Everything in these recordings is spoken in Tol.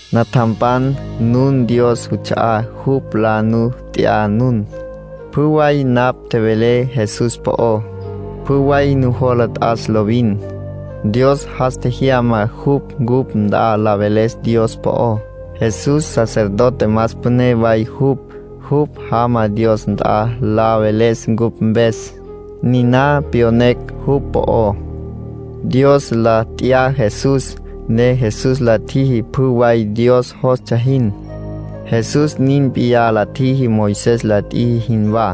Natjampan, nun Dios juts'a'á. Jupj la nu t'ya nun. Pjü way napj tjevelé Jesús po'ó, pjü way nujola t'as lovin. Dios jas tjejyama jupj cupj nt'a la veles Dios po'ó. Jesús sacerdote más püné way jupj; jupj jama Dios nt'a la veles cupj mpes. Niná pyonecj jupj po'ó. Dios la t'ya Jesús, ne Jesús la tjiji pjü way Dios jostsja jin. Jesús nin p'iyá la tjiji Moisés la tjiji jinwá,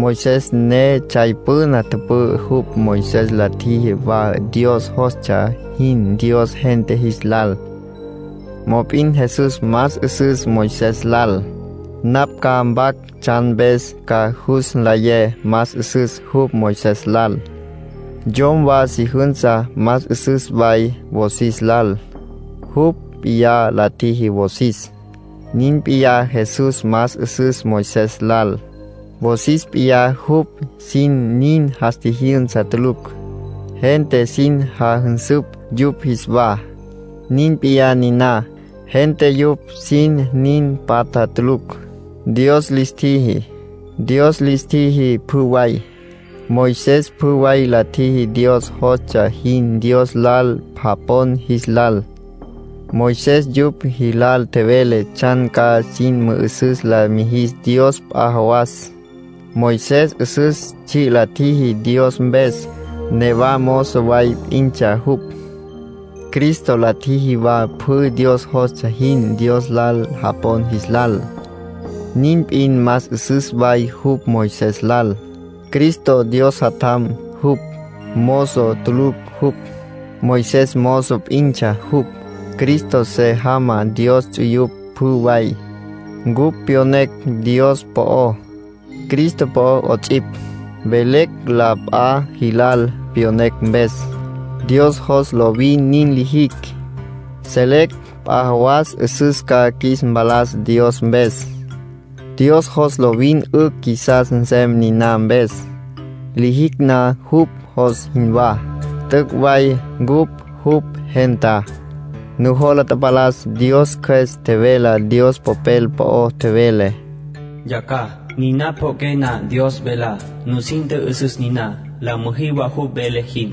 Moisés ne tsjay püna tüpü'ü jupj. Moisés la tjiji wa Dios jostsja jin Dios gente jis lal. Mop'in Jesús más 'üsüs Moisés lal. Napj ca mpac tsjan mpes ca jus nlayé más 'üsüs jupj Moisés lal. Yom wa si jünsa más 'üsüs way wosis lal; jupj p'iyá la tjiji wosis. Nin p'iyá, Jesús más 'üsüs Moisés lal. Wosis p'iyá jupj sin nin jas tjijyünsa tulucj. Gente sin jajünsüpj yupj jis wa. Nin p'iyá niná, gente yupj sin nin patja tulucj. Dios lis tjiji. Dios lis tjiji pjü way. Moisés pjü way la tjiji Dios jostsja jin Dios lal japon jis lal. Moisés yupj jilal tjevele tsjan ca sin mü'üsüs la mijis Dios p'a jawas. Moisés 'üsüs tsji' la tjiji Dios mpes; newa mozo way p'intsja jupj. Cristo la tjiji wa pjü Dios jostsja jin Dios lal japon jis lal. Nin p'in más 'üsüs way jupj Moisés lal. Cristo Dios Jatjam jupj, mozo tulucj jupj. Moisés mozo p'intsja jupj. Cristo se jamá Dios ts'uyupj pjü way. Cupj pyonecj Dios po'ó, Cristo po'ó 'ots'ipj; velecj la p'a jilal pyonecj mpes. Dios jos lovin nin lijicj. Selecj p'a jawas 'üsüs ca qjuis mpalas Dios mpes. Dios jos lovin 'ücj qjuisas nsem niná mpes. Lijicj na jupj jos jinwá, t'üc' way cupj jupj gentá. Nujola tapalas Dios Cjües tjevelá Dios Popel po'ó. Tjevele: “Yacjaj, niná pjo'oqué na Dios velá, nusin tjü'üsüs niná, la müjí wa jupj vele jin.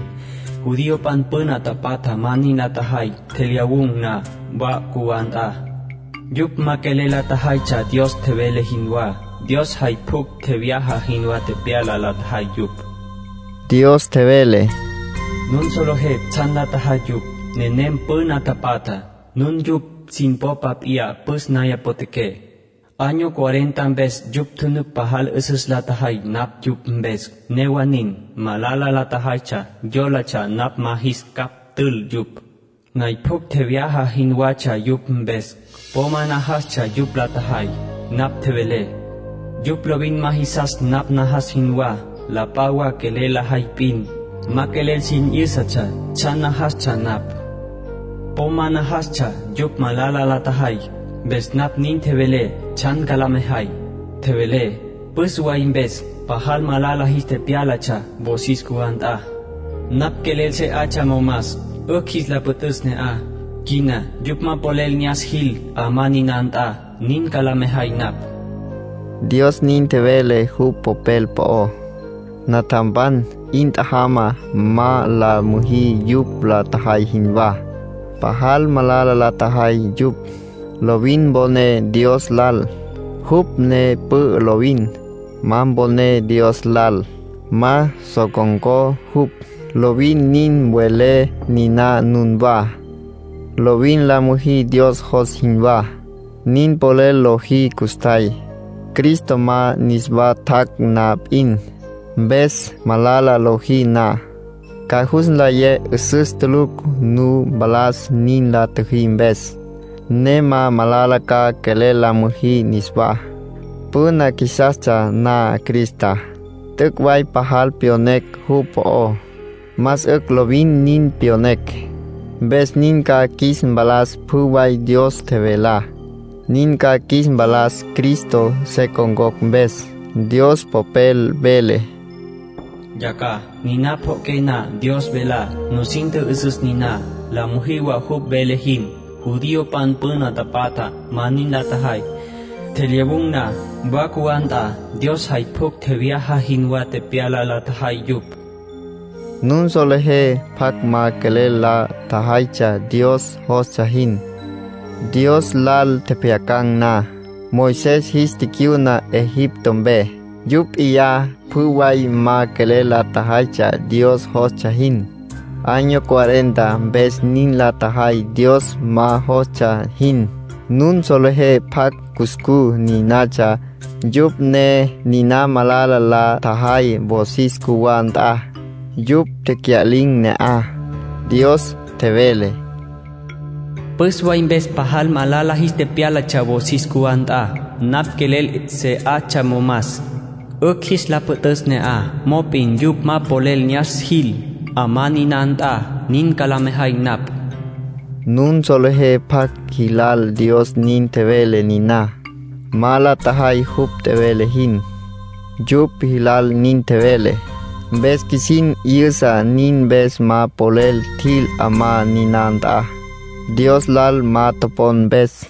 Judiopan püna tapatja ma nin la tjajay tjelyawun̈ na wa cjuwá nt'a. Yupj ma quelel la tjajaytsja Dios tjevele jinwá. Dios jay pjucj tjevyaja jinwá tepyala la tjajay yupj.” Dios tjevele: “Nun solejé tsjan la tjajay yupj. Nenem püna tapatjá, nun yupj sin popa p'iyá püs naya potjaqué. Año cuarenta mpes yupj tjunuc pajal 'üsüs la tjejay napj yupj mpes. Newa nin, malala la tjajaytsja, yólatsja napj ma jis capj ntül yupj. Nay pjucj tjevyaja jinwatsja yupj mpes. Po ma najastsja yupj la tjajay. Napj tjevelé: ‘Yupj lovin ma jisas napj najas jinwá. La p'a wa quelel lajay p'in. Ma quelel sin 'yǘsatsja tsjan najastsja napj.’ Po ma najastsja yupj malala la tjajay. Mpes napj nin tjevelé tsjan ca la mejay. Tjevelé: ‘Püs way mpes pajal malala jis tepyálatsja wosis cjuwá nt'a. Napj quelel se 'atsja momas, 'ücj jis la püt'üs ne'aj. Quina yupj ma polel ne'as jil 'amá niná nt'a, nin ca la mejay napj.’” Dios nin tjevele jupj Popel po'ó. Natjampan, 'in tjajama. Ma la müjí yupj la tjajay jinwá; pajal malala la tjajay yupj. Lovin mponé Dios lal, jupj ne pü'ü lovin. Ma poné Dios lal, ma so con̈có jupj. Lovin nin mvelé niná nunwá. Lovin la müjí Dios jos jinwá. Nin polel lojí custjay, Cristo ma niswa tjac' na p'in. Mpes malala lojí na, ca jus nlayé 'üsüs tulucj nu mpalas nin la tjüjí mpes, ne ma malala ca quelel la müjí niswá. Püna qjuisastsja na Cristá, t'üc' way pajal tepyonecj jupj po'ó. Más 'ücj lovin nin pyonecj. Mpes nin ca qjuis mpalas pjü way Dios tjevelá. Nin ca qjuis mpalas Cristo se con̈cocj mpes. Dios Popel vele: “Yacjaj, niná pjo'oqué na Dios velá, nusin tjü'üsüs niná, la müjí wa jupj vele jin. Judiopan püna tapatja ma nin la tjajay, tjelyawun̈ na wa cjuwá nt'a. Dios jay pjucj tjevyaja jinwá tepyala la tjajay yupj.” Nun solejé pjacj ma quelel la tjajaytsja Dios jostsja jin, Dios lal tjepjyacan̈ na. Moisés jis ticyuna Egipto mpe, yupj p'iyá pjü way ma quelel la tjajaytsja Dios jostsja jin. Año cuarenta mpes nin la tjajay Dios ma jostsja jin. Nun solejé pjacj cuscú ninatsja. Yupj ne niná malala la tjajay wosis cjuwá nt'a. Yupj tecya'lin̈ ne'aj. Dios tjevele: “Püs way mpes pajal malala jis tepyálatsja wosis cjuwá nt'a. Napj quelel se 'atsja momas, 'ücj jis la püt'üs ne'aj. Mop'in yupj ma polel ne'as jil 'amá niná nt'a, nin ca la mejay napj.” Nun solejé pjacj jilal Dios nin tjevele niná. Ma la tjajay jupj tjevele jin, yupj jilal nin tjevele. Mpes qjuisin 'yüsa nin mpes ma polel tjil 'amá niná nt'a, Dios lal ma topon mpes.